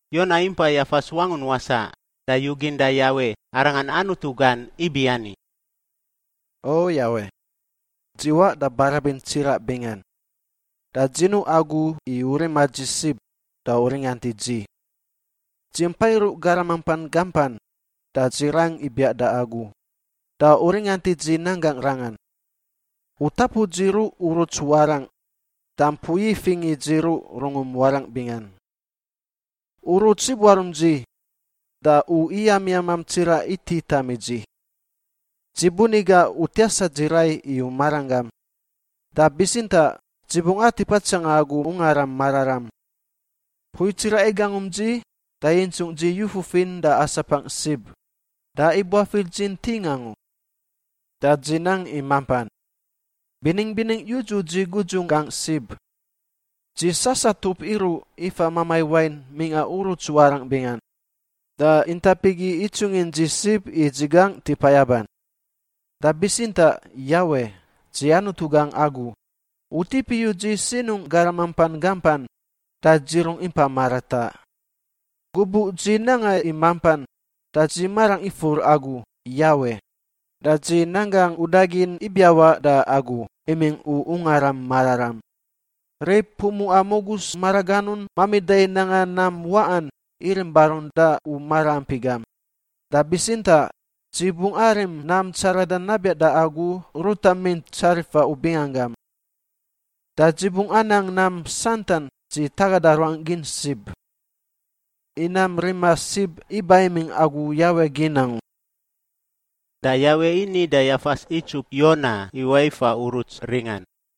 Yona impa yafas wangun wasaꞌ da yugin da Yawe, arangan Anutu gan, ibiani, “O Yawe! Dzi waꞌ da barabin tsiraꞌ bingan, da dzi nuꞌ Agu i U rima dzi sib, da U ringant i dzi. Dzi mpa iruꞌ garam mampan gampan, da dzi rang ibiaꞌ da Agu, da U ringant i dzi nanggangꞌ rangan. U tapu dzi ruꞌ uruts warangꞌ da mpui ifingꞌ i dzi ruꞌ rungum warangꞌ bingan. Uruts ibuarum dzi da U iyamiyamam tsiraꞌ ititam i dzi. Dzi buni gaꞌ U tiasa dzi rai i U maranggam, da bitsintaꞌ dzi bungꞌ atip atsanga Agu Ungaram Mararam. Mpui tsiraꞌ igangum dzi da yintsungꞌ dzi yu fufin da asapangꞌ sib da ibuafir dzi nting angu. Da dzi nang i mampan. Biningꞌ biningꞌ yudzu dzi gudzungꞌ gangꞌ sib. Dzi sasatup iruꞌ ifa mamai wain mingꞌa uruts warangꞌ bingan, da intap igi itsungin dzi sib i dzi gangꞌ tipa yaban. Da bitsintaꞌ Yawe, dzi Anutu gangꞌ Agu; U tip iyu dzi sinungꞌ garam mampan gampan da dzi rungꞌ impa marataꞌ. Gubuꞌ dzi nanga i mampan da dzi marangꞌ ifur Agu, Yawe, da dzi nan gangꞌ udagin ibiawaꞌ da Agu imingꞌ U Ungaram Mararam. Rib pumuꞌa mugus maraganun mamida i nanga nam waꞌan irim barun da U maraampi gam. Da bitsintaꞌ dzi bungꞌ arim nam tsaradan nabiaꞌ da Agu ruta mint tsarifa U binganggam. Da dzi bungꞌ anang nam santan dzi tagada ruangꞌ gin sib. I nam rima sib iba imingꞌ Agu Yawe gin angu.” Da Yawe ini da yafas itsup Yona iwaꞌ ifa uruts ringan.